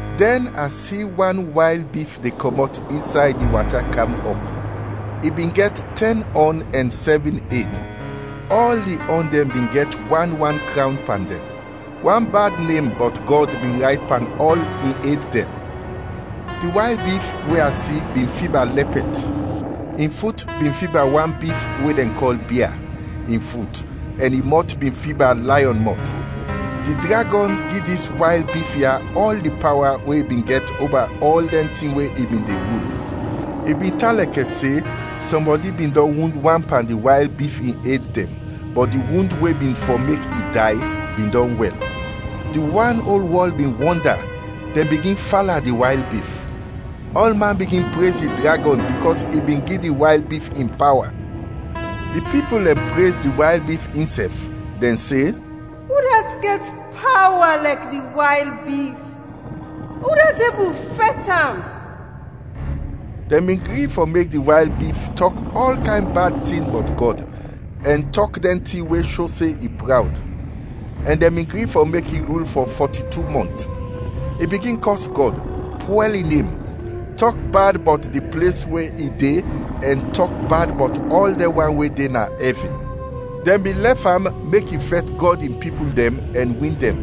Dɛn a si wan wayl bif de kɔmɔt insay di wata kam ɔp. I bin gɛt tɛn ɔn ɛn sɛvin ed, ɔl di ɔn dɛn bin gɛt wan wan krawn pan dɛn; wan bad nem bɔt Gɔd bin rayt pan ɔl in ed dɛn. Di wayl bif we a si bin fiba lɛpɛt, in fut bin fiba wan bif we dɛn kɔl bia, in fut, ɛn in mɔt bin fiba layɔn mɔt. Di dragɔn gi dis wayl bif ya ɔl di pawa we i bin gɛt oba ɔl dɛn tin we i bin de rul. I bin tan lɛkɛ se sɔmbɔdi bin dɔn wund wan pan di wayl bif in ed dɛn, bɔt di wund we bin fɔ mek i day, bin dɔn wɛl. Di wan ol wɔl bin wɔnda, dɛn bigin fala di wayl bif. Ɔlman bigin prez di dragɔn bikɔs i bin gi di wayl bif in pawa. Di pipul dɛn prez di wayl bif insɛf, dɛn se, “Udat gɛt pawa lɛkɛ di wayl bif? Udat ebul fɛt am?” Dɛn bin gri fɔ mek di wayl bif tɔk ɔl kayn bad tin bɔt Gɔd ɛn tɔk dɛn tin we sho se i prawd; ɛn dɛn bin gri fɔ mek i rul fɔ fɔti-tu mɔnt. I bigin kɔs Gɔd, pwɛl in nem, tɔk bad bɔt di ples we i de ɛn tɔk bad bɔt ɔl dɛn wan we de na ɛvin. Dɛn bin lɛf am mek i fɛt Gɔd in pipul dɛn ɛn win dɛn,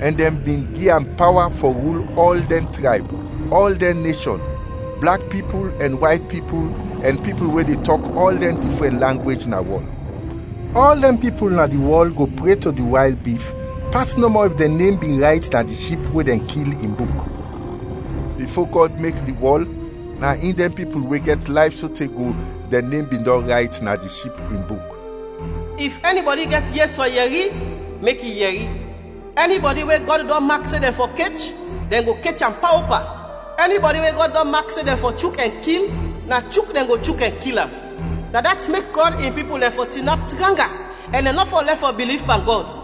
ɛn dɛn bin gi am pawa fɔ rul ɔl dɛn trayb, ɔl dɛn neshɔn, blak pipul ɛn wayt pipul ɛn pipul we de tɔk ɔl dɛn difrɛn langwej na wɔl. Ɔl dɛn pipul na di wɔl go pre to di wayl bif, pas nɔmɔ if dɛn nem bin rayt na di Ship we dɛn kil, in buk. Bifo Gɔd mek di wɔl, na in dɛn pipul we gɛt layf sote go dɛn nem bin dɔn rayt na di Ship in buk. “If ɛnibɔdi gɛt yes fɔ yɛri, mek i yɛri! Ɛnibɔdi we Gɔd dɔn mak se dɛn fɔ kech, dɛn go kech am paopa; ɛnibɔdi we Gɔd dɔn mak se dɛn fɔ chuk ɛn kil, na chuk dɛn go chuk ɛn kil am. Na dat mek Gɔd in pipul dɛn fɔ tinap tranga ɛn dɛn nɔ fɔ lɛf fɔ biliv pan Gɔd.”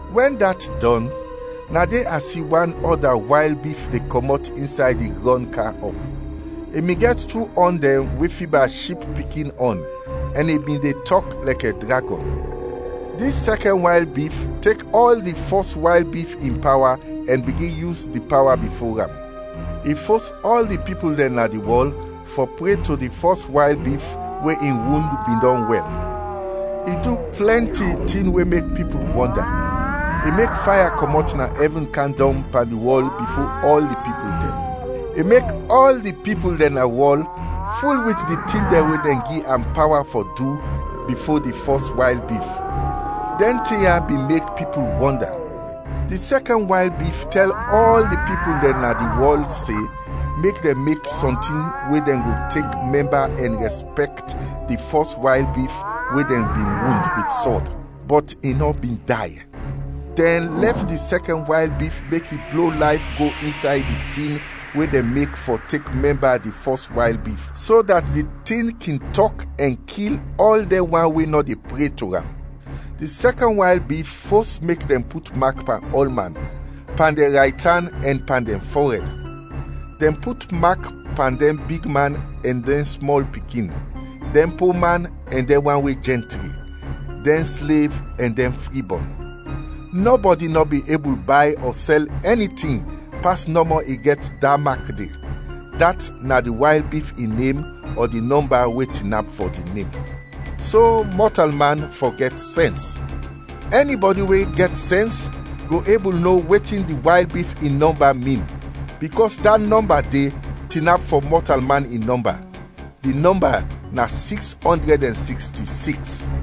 Wɛn dat dɔn, na de a si wan ɔda wayl bif de kɔmɔt insay di grɔn kam ɔp. I bin gɛt tu ɔn dɛn we fiba ship pikin ɔn, ɛn i bin de tɔk lɛkɛ dragɔn. Dis sɛkɛn wayl bif tek ɔl di fɔs wayl bif in pawa ɛn bigin yus di pawa bifo am. I fos ɔl di pipul dɛn na di wɔl fɔ pre to di fɔs wayl bif we in wund bin dɔn wɛl. I du plɛnti tin we mek pipul wɔnda, i mek faya kɔmɔt na ɛvin kam dɔng pan di wɔl bifo ɔl di pipul dɛn. I mek ɔl di pipul dɛn na wɔl ful wit di tin dɛn we dɛn gi am pawa fɔ du bifo di fɔs wayl bif; dɛn tin ya bin mek pipul wɔnda. Di sɛkɛn wayl bif tɛl ɔl di pipul dɛn na di wɔl se mek dɛn mek sɔntin we dɛn go tek mɛmba ɛn rɛspɛkt di fɔs wayl bif we dɛn bin wund wit sɔd, bɔt i nɔ bin day. Dɛn lɛf di sɛkɛn wayl bif mek i blo layf go insay di tin we dɛn mek fɔ tek mɛmba di fɔs wayl bif, so dat di tin kin tɔk ɛn kil ɔl dɛn wan we nɔ de pre to am. Di sɛkɛn wayl bif fos mek dɛn put mak pan ɔlman, pan dɛn raytan ɛn pan dɛn fɔrɛd; dɛn put mak pan dɛn bigman ɛn dɛn smɔl pikin, dɛn po man ɛn dɛn wan we jɛntri, dɛn slev ɛn dɛn fribɔn. Nɔbɔdi nɔ bin ebul bay ɔ sɛl ɛni tin pas nɔmɔ i gɛt da mak de, dat na di wayl bif in nem ɔ di nɔmba we tinap fɔ di nem. So mɔtalman fɔ gɛt sɛns. Ɛnibɔdi we gɛt sɛns go ebul no wetin di wayl bif in nɔmba min, bikɔs da nɔmba de tinap fɔ mɔtalman in nɔmba. Di nɔmba na siks ɔndrɛd ɛn siksti siks.